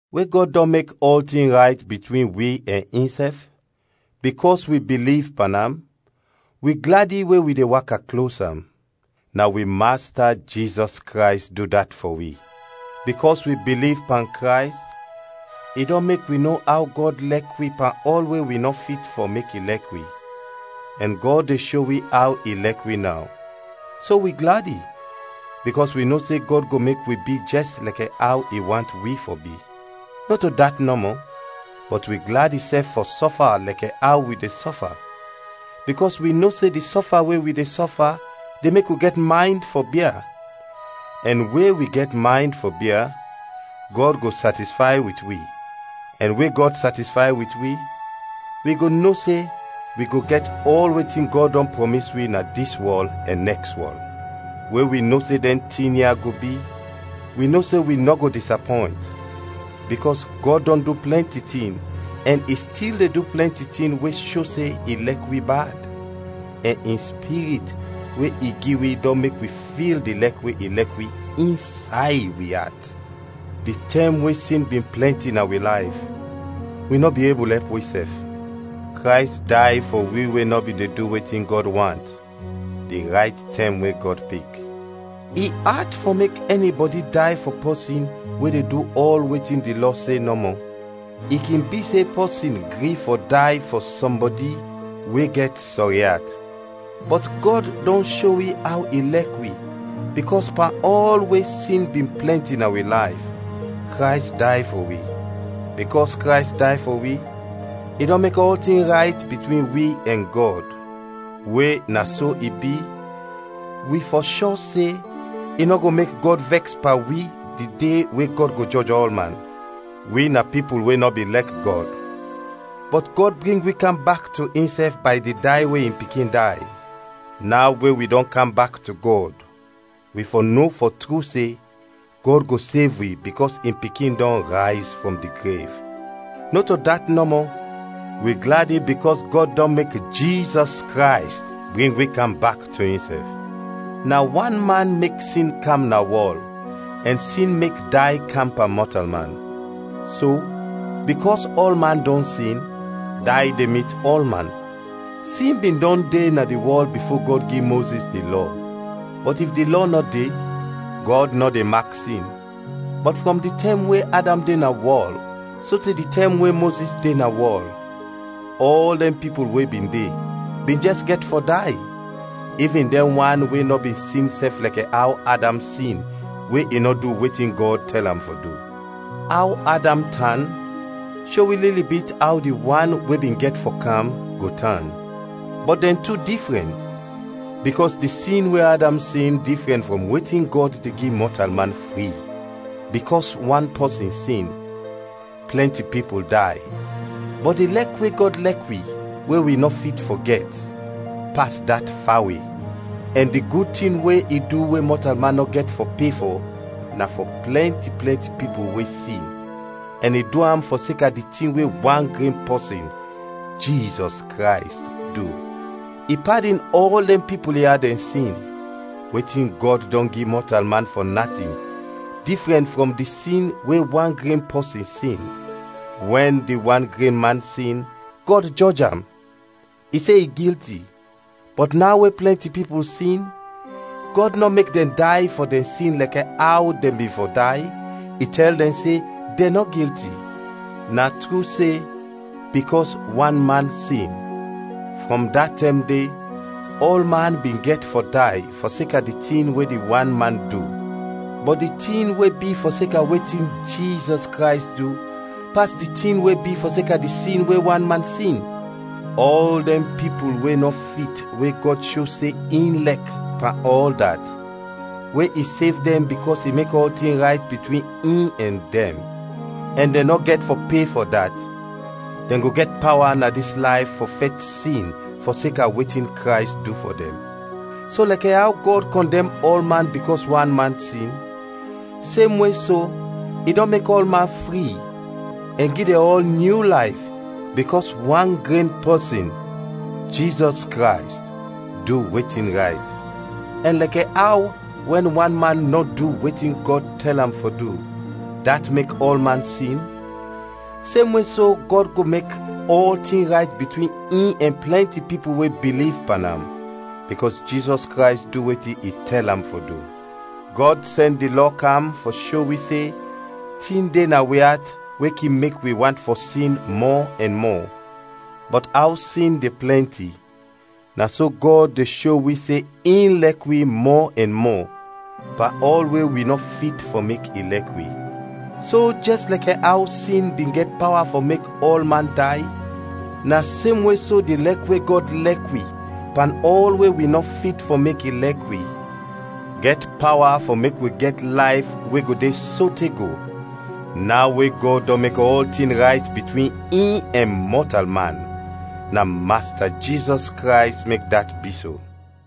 We Gɔd dɔn mek ɔltin rayt bitwin wi ɛn insɛf, bikɔs wi biliv pan am, wi gladi we wi de waka klos am; na wi Masta Jizɔs Krays du dat fɔ wi. Bikɔs wi biliv pan Krays, i dɔn mek wi no aw Gɔd lɛk wi pan ɔl we wi nɔ fit fɔ mek i lɛk wi, ɛn Gɔd de sho wi aw i lɛk wi naw. So wi gladi, bikɔs wi no se Gɔd go mek wi bi jɛs lɛkɛ aw i want wi fɔ bi. Nɔto dat nɔmɔ, bɔt wi gladi sɛf fɔ sɔfa lɛkɛ aw wi de sɔfa, bikɔs wi no se di sɔfa we wi de sɔfa de mek wi gɛt maynd fɔ bia, ɛn we wi gɛt maynd fɔ bia, Gɔd go satisfay wit wi, ɛn we Gɔd satisfay wit wi, wi go no se wi go gɛt ɔl wetin Gɔd dɔn prɔmis wi na dis wɔl ɛn nɛks wɔl. We wi no se dɛn tin ya go bi, wi no se wi nɔ go disapɔynt, bikɔs Gɔd dɔn du plɛnti tin ɛn i stil de du plɛnti tin we sho se i lɛk wi bad, ɛn in Spirit we i gi wi dɔn mek wi fil di lɛk we i lɛk wi insay wi at. Di tɛm we sin bin plɛnti na wi layf, wi nɔ bin ebul ɛp wisɛf; Krays day fɔ wi we nɔ bin de du wetin Gɔd want, di rayt tɛm we Gɔd pik. I at fɔ mek ɛnibɔdi day fɔ pɔsin we de du ɔl wetin di Lɔ se nɔmɔ. I kin bi se pɔsin gri fɔ day fɔ sɔmbɔdi we gɛt sɔri at. Bɔt Gɔd dɔn sho wi aw i lɛk wi bikɔs pan ɔl we sin bin plɛnti na wi layf, Krays day fɔ wi. Bikɔs Krays day fɔ wi, i dɔn mek ɔltin rayt bitwin wi ɛn Gɔd. We na so i bi, wi fɔ shɔ se, i nɔ go mek Gɔd vɛks pan wi di de we Gɔd go jɔj ɔlman. Wi na pipul we nɔ bin lɛk Gɔd, bɔt Gɔd bring wi kam bak to insɛf bay di day we in Pikin day; naw we wi dɔn kam bak to Gɔd, wi fɔ no fɔ tru se Gɔd go sev wi bikɔs in Pikin dɔn rayz frɔm di grev. Nɔto dat nɔmɔ, wi gladi bikɔs Gɔd dɔn mek Jizɔs Krays bring wi kam bak to insɛf. Na wan man mek sin kam na wɔl ɛn sin mek day kam pan mɔtalman. So, bikɔs ɔlman dɔn sin, day de mit ɔlman. Sin bin dɔn de na di wɔl bifo Gɔd gi Mozis di Lɔ; bɔt if di Lɔ nɔ de, Gɔd nɔ de mak sin. Bɔt frɔm di tɛm we Adam de na wɔl sote di tɛm we Mozis de na wɔl, ɔl dɛn pipul we bin de, bin jɛs gɛt fɔ day, ivin dɛn wan we nɔ bin sin sɛf lɛkɛ aw Adam sin we i nɔ du wetin Gɔd tɛl am fɔ du. Aw Adam tan, sho wi lili bit aw di wan we bin gɛt fɔ kam, go tan. Bɔt dɛn tu difrɛn, bikɔs di sin we Adam sin difrɛn frɔm wetin Gɔd de gi mɔtalman fri. Bikɔs wan pɔsin sin, plɛnti pipul day, bɔt di lɛk we Gɔd lɛk wi we wi nɔ fit fɔ gɛt, pas dat fawe; ɛn di gud tin we i du we mɔtalman nɔ gɛt fɔ pe fɔ na fɔ plɛnti, plɛnti pipul we sin, ɛn i du am fɔseka di tin we wan gren pɔsin, Jizɔs Krays, du. I padin ɔl dɛn pipul ya dɛn sin. Wetin Gɔd dɔn gi mɔtalman fɔ natin difrɛn frɔm di sin we wan gren pɔsin sin; wɛn di wan gren man sin, Gɔd jɔj am, i se i gilti; bɔt naw we plɛnti pipul sin, Gɔd nɔ mek dɛn day fɔ dɛn sin lɛkɛ aw dɛn bin fɔ day, i tɛl dɛn se, dɛn nɔ gilti. Na tru se, bikɔs wan man sin, frɔm da tɛm de, ɔlman bin gɛt fɔ day fɔseka di tin we di wan man du. Bɔt di tin we bi fɔseka wetin Jizɔs Krays du pas di tin we bi fɔseka di sin we wan man sin. Ɔl dɛn pipul we nɔ fit we Gɔd sho se in lɛk pan ɔl dat, we i sev dɛn bikɔs i mek ɔltin rayt bitwin in ɛn dɛn, ɛn dɛn nɔ gɛt fɔ pe fɔ dat, dɛn go gɛt pawa na dis layf fɔ fɛt sin fɔseka wetin Krays du fɔ dɛn. So lɛkɛ aw Gɔd kɔndɛm ɔlman bikɔs wan man sin, semwe so, i dɔn mek ɔlman fri, ɛn gi dɛn ɔl nyu layf bikɔs wan gren pɔsin, Jizɔs Krays, du wetin rayt. Ɛn lɛkɛ aw wɛn wan man nɔ du wetin Gɔd tɛl am fɔ du, dat mek ɔlman sin; semwe so Gɔd go mek ɔltin rayt bitwin in ɛn plɛnti pipul we biliv pan am, bikɔs Jizɔs Krays du wetin i tɛl am fɔ du. Gɔd sɛn di Lɔ kam fɔ sho wi se tin de na wi at we kin mek wi want fɔ sin mɔ ɛn mɔ; bɔt aw sin de plɛnti, na so Gɔd de sho wi se in lɛk wi mɔ ɛn mɔ, pan ɔl we wi nɔ fit fɔ mek i lɛk wi. So jɛs lɛkɛ aw sin bin gɛt pawa fɔ mek ɔlman day, na semwe so di lɛk we Gɔd lɛk wi pan ɔl we wi nɔ fit fɔ mek i lɛk wi, gɛt pawa fɔ mek wi gɛt layf we go de sote go, naw we Gɔd dɔn mek ɔltin rayt bitwin in ɛn mɔtalman na Masta Jizɔs Krays mek dat bi so.